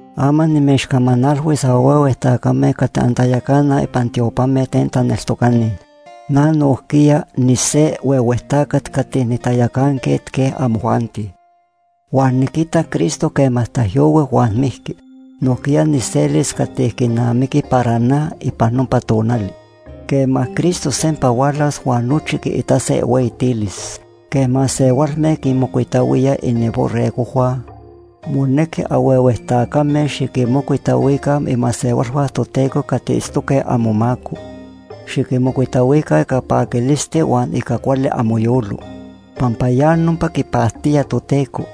Ama nimechcamanalhuis anhuehue tacame cati antayacanaj ipan tiopame ten taneltocani. Na nojquiya nise huehue tacat cati nitayacanquet quej amojuanti. Huan niquitac Cristo quema taijyohui huan mijqui. Nojquiya nijselis cati quinamiqui para na ipan nopa tonali quema Cristo sempa hualas huan nochi quiitase ihueyitilis. Quej masehualme quinmocuitahuíaj ininborregojhua, monequi anhuehue tacame xiquinmocuitahuica imasehualhua Toteco cati itztoque amomaco. Xiquinmocuitahuica ica paquilisti huan ica cuali amoyolo, pampa ya nopa quipactía Toteco.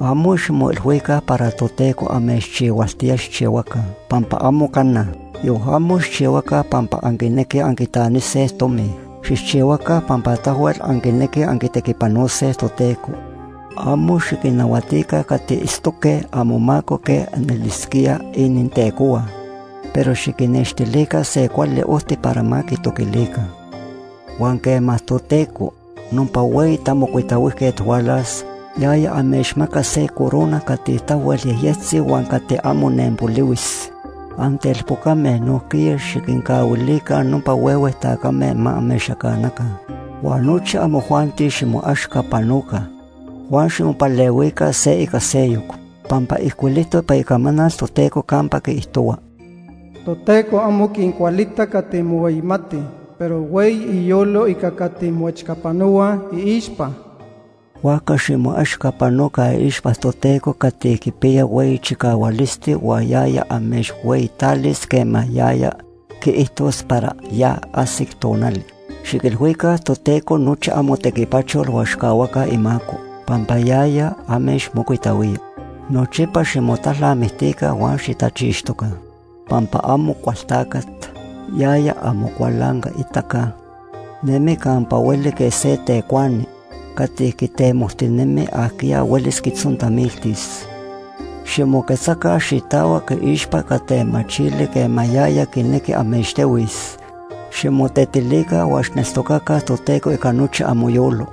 Amo ximoilhuica para Toteco amechchihualtía xijchihuaca, pampa amo cana. Yon amo xijchihuaca pampa anquinequij anquitanise tomi. Xijchihuaca pampa tahuel anquinequij anquitequipanose Toteco. Amo xiquinnahuatica cati itztoque amomaco quej anelisquíaj inintecohua. Pero xiquinnextilica se cuali ojti para ma quitoquilica. Huan quema Toteco, nopa Hueyi Tamocuitahuijquet hualas, yaya amechmacas se corona cati tahuel yejyectzi huan cati amo nenpolihuis. Antelpocame, nojquiya xiquincahuilica nopa huehue tacame ma amechyacanaca. Huan nochi amojuanti ximoechcapanoca huan ximopalehuica se ica seyoc pampa ijcuilijtoc ipan Icamanal Toteco campa quiijtohua: “Toteco amo quincualita cati mohueyimatij, pero hueyi iyolo ica cati moechcapanohuaj iixpa.” Huajca ximoechcapanoca iixpa Toteco cati quipiya hueyi chicahualisti huan yaya amechhueyitalis quema yaya quiijtos para ya ajsic tonali. Xiquilhuica Toteco nochi amotequipachol huan xijcahuaca imaco, pampa yaya amechmocuitahuía. Nochipa ximotalnamictica huan xitachixtoca, pampa Amocualtacat, yaya amocualancaitaca, nemi campa hueli quej se tecuani cati quitemojtinemi ajquiya huelis quitzontamiltis. Ximoquetzaca xitahuac iixpa ica temachili quema yaya quinequi amechtehuis. Ximotetilica huan xijneltocaca Toteco ica nochi amoyolo.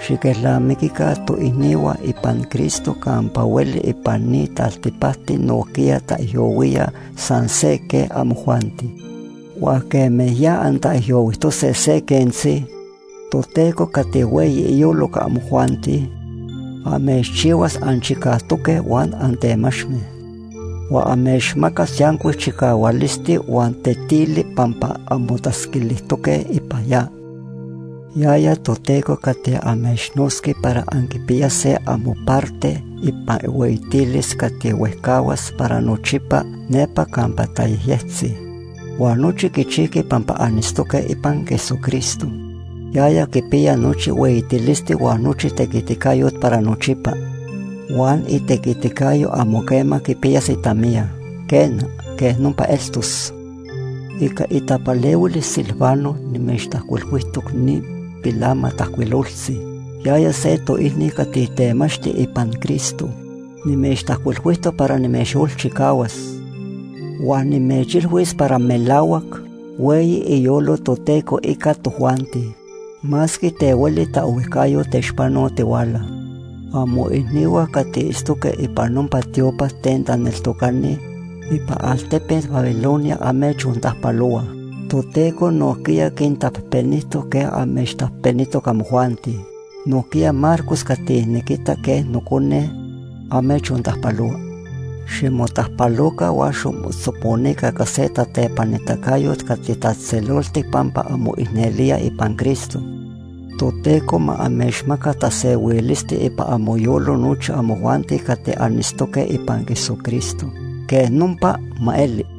Xiquelnamiquica toicnihua ipan Cristo campa hueli ipan ni taltipacti nojquiya taijyohuíaj san se quej amojuanti. Huan quema ya antaijyohuijtose se quentzi, Toteco cati hueyi iyolo ica amojuanti amechchihuas anchicajtoque huan antemachme. Huan amechmacas yancuic chicahualisti huan tetili pampa anmotatzquilijtoque ipan ya. Yaya Toteco cati amechnotzqui para anquipiyase amoparte ipan ihueyitilis cati huejcahuas para nochipa nepa campa tayejyectzi. Huan nochi quichijqui pampa anitztoque ipan Jesucristo. Yaya quipiya nochi hueyitilisti huan nochi tequiticayot para nochipa. Huan itequiticayo amo quema quipiyas itamiya. Quena, quej nopa eltos. Ica itapalehuil Silvano nimechtajcuilhuijtoc ni pilamatajcuiloltzi. Yaya se toicni cati temachti ipan Cristo. Nimechtajcuilhuijtoc para nimechyolchicahuas huan nimechilhuis para melahuac hueyi iyolo Toteco ica tojuanti masque ten hueli taohuijcayot techpanotihuala. Amoicnihua cati itztoque ipan nopa tiopa ten taneltocani ipan altepet Babilonia amechontajpalohuaj. Toteco nojquiya quintapejpenijtoc quej amechtapejpenijtoc amojuanti. Nojquiya Marcos cati niquita quej nocone, amechontajpalohua. Ximotajpaloca huan ximotzoponica ica se tatepanitacayot cati tatzejtzeloltic pampa anmoicnelíaj ipan Cristo. Toteco ma amechmaca tasehuilisti ipan amoyolo nochi amojuanti cati anitztoque ipan Jesucristo. Quej nopa ma eli.